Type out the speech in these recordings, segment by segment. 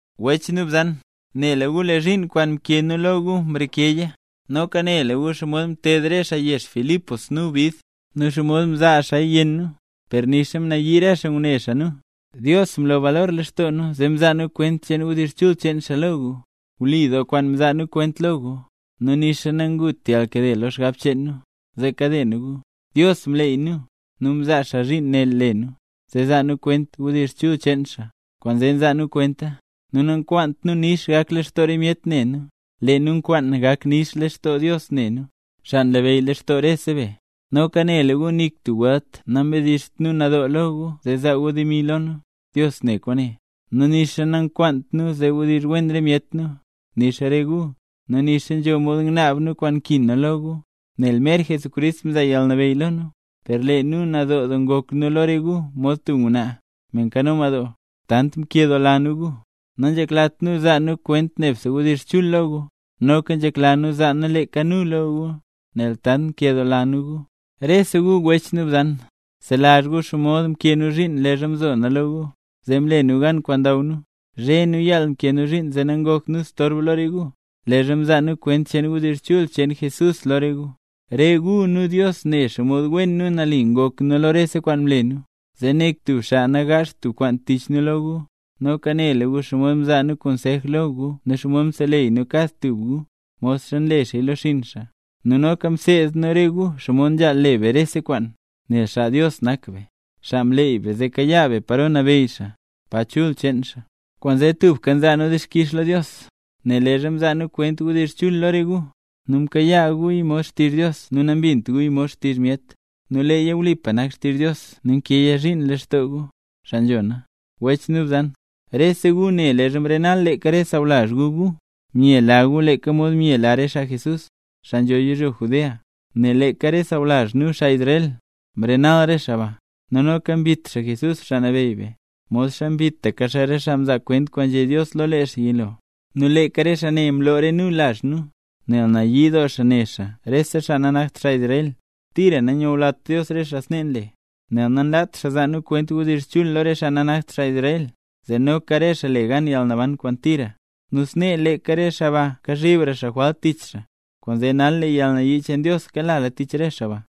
Wech nu bzan, nela gu lee zhiin kwaan mkee nu lo gu mrekeya. Noka nela gu xomod mted re xaa yezh Filipos nu bid, nu xomod mzaa xaaya yenn nu, per nixa mnayii re xaa ngune nu, Dios mlo balor lextoo nu zee mzaa nu kwent wdizh chul cheen xaa lo gu. Wli doo kwaan mzaa nu kwent lo gu, nu nixa nangut yalnkade lo xgab cheen nu, zee kade nu gu. Dios mleey nu, nu mzaa xaa zhiin ne le nu, zee zaa nu kwent wdizh chul cheen xaa, kwaanzee nzaa nu kwenta. Nu nankwaant nu nix gak lextoo re myet ne nu, lee nu nkwaan gak nix lextoo Dios ne nu, xaa nlabeyy lextoo rese be. Noka nela gu nik tub welt nambedizht nu nadoo lo gu zee zaa gu demi lo nu; Dios ne kwaane. Nu nixa namkwaant nu zee wdizh wen re myet nu, nixa re gu; nu nixa nzho mod ngnaab nu kwaan nkin nu lo gu, nel mer Jesucrist mzaa yalnabeyy lo nu, per lee nu nadoo doo ngok nu lo re gu mod tub ngwnaa, me nkano madoo. Tant mkeladoo nu gu, nanzheklat nu zaa nu kwent nebse wdizh chul lo gu, noka nzhekla nu zaa nu leeka nu lo gu, nel tant nkeladoo nu gu. Rese gu wech nu bzan, selazh gu xomod mkee nu zhiin leezha mzo na lo gu, zee mle nu gan kwaan ndaw nu. Zhe nu yaal mkee nu zhiin zee nangokt nu storb lo re gu, leezha mzaa nu kwent wdizh chul cheen Jesús lo re gu. Re gu nu Dios ne xomod wen nu nali ngok nu lo re kwaan mle nu, zee nik tub xaa nagaazht tub kwaan tich nu lo gu. Noka nela gu xomod mzaa nu konsej lo gu nu xomod mseleyy nu kad tub gu, modxa nle xaa lo xinn xaa. Nu noka mseed nu re gu xomod nzhaal le be rese kwaan nel xaa Dios nak be, xaa mleeyla be zee kayaa be paro nabeyy xaa, pa chul cheen xaa. Kwaanzee tubka nzaa nu dixkix lo Dios, nel leezha mzaa nu kwent wdizh chul lo re gu, nu mkayaa guya mod xtizh Dios nu nambint guya mod xtizh myet. Nu leeya wlipa nak xtizh Dios nu nkeeya zhiin lextoo gu, xaa nzhona. Wech nu bzan, rese gu ne leezha mrenal leeka re sawlazh gu gu, myela gu leeka mod myela re xaa Jesús, xaa nzho yizhyo Judea, nel leeka re sawlazh nu xaa Israel, mrenal re xaa ba, nu noka mbit xaa Jesús, Xaa Nabeyy be, modxa mbitaka xaa re xaa mzaa kwent kwaan nzhé Dios lo lee xaa yilo, nu leeka re xaa ne mloo re nu lazh nu, nel nayii doo xaa ne xaa rese xaa nanakt xaa Israel. Tira nanyulat Dios re xaa snee nle, nel nanlaat xaa zaa nu kwent wdizh chul lo re xaa nanakt xaa Israel, zee noka re xaa le gan yalnaban kwaan tira. Nu snee leeka re xaa ba kazhibra jwalt tich xaa. Kwaanzee nal lee yalnayii cheen Dios kalala tich re xaa ba.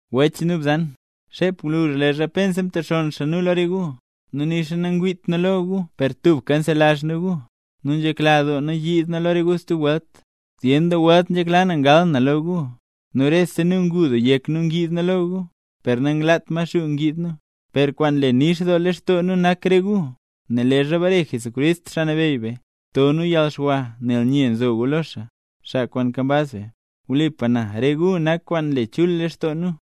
Wech nu bzan, xep gwluzh leezha pensa mtexonn xaa nu lo re gu, nu nixa nangwiit nu gu per tubka nzelazh nu gu, nu nzhekla doo nu yiid nu lo re gu stub welt. Zyen doo welt nzhekla na ngal na lo gu, nu rese nu ngu doo yek ngid lo gu, per nanglaat Maxuu ngid nu. Per kwaan nle nix doo lextoo nu nak re gu. Nel leezha bare Jesucrist, Xaa Nabeyy be, to nu yalxwa nel nye nzo gu lo xaa, xaa kwaan nkambaz be. Wlipa na, re gu nak kwaan nle chul lextoo nu.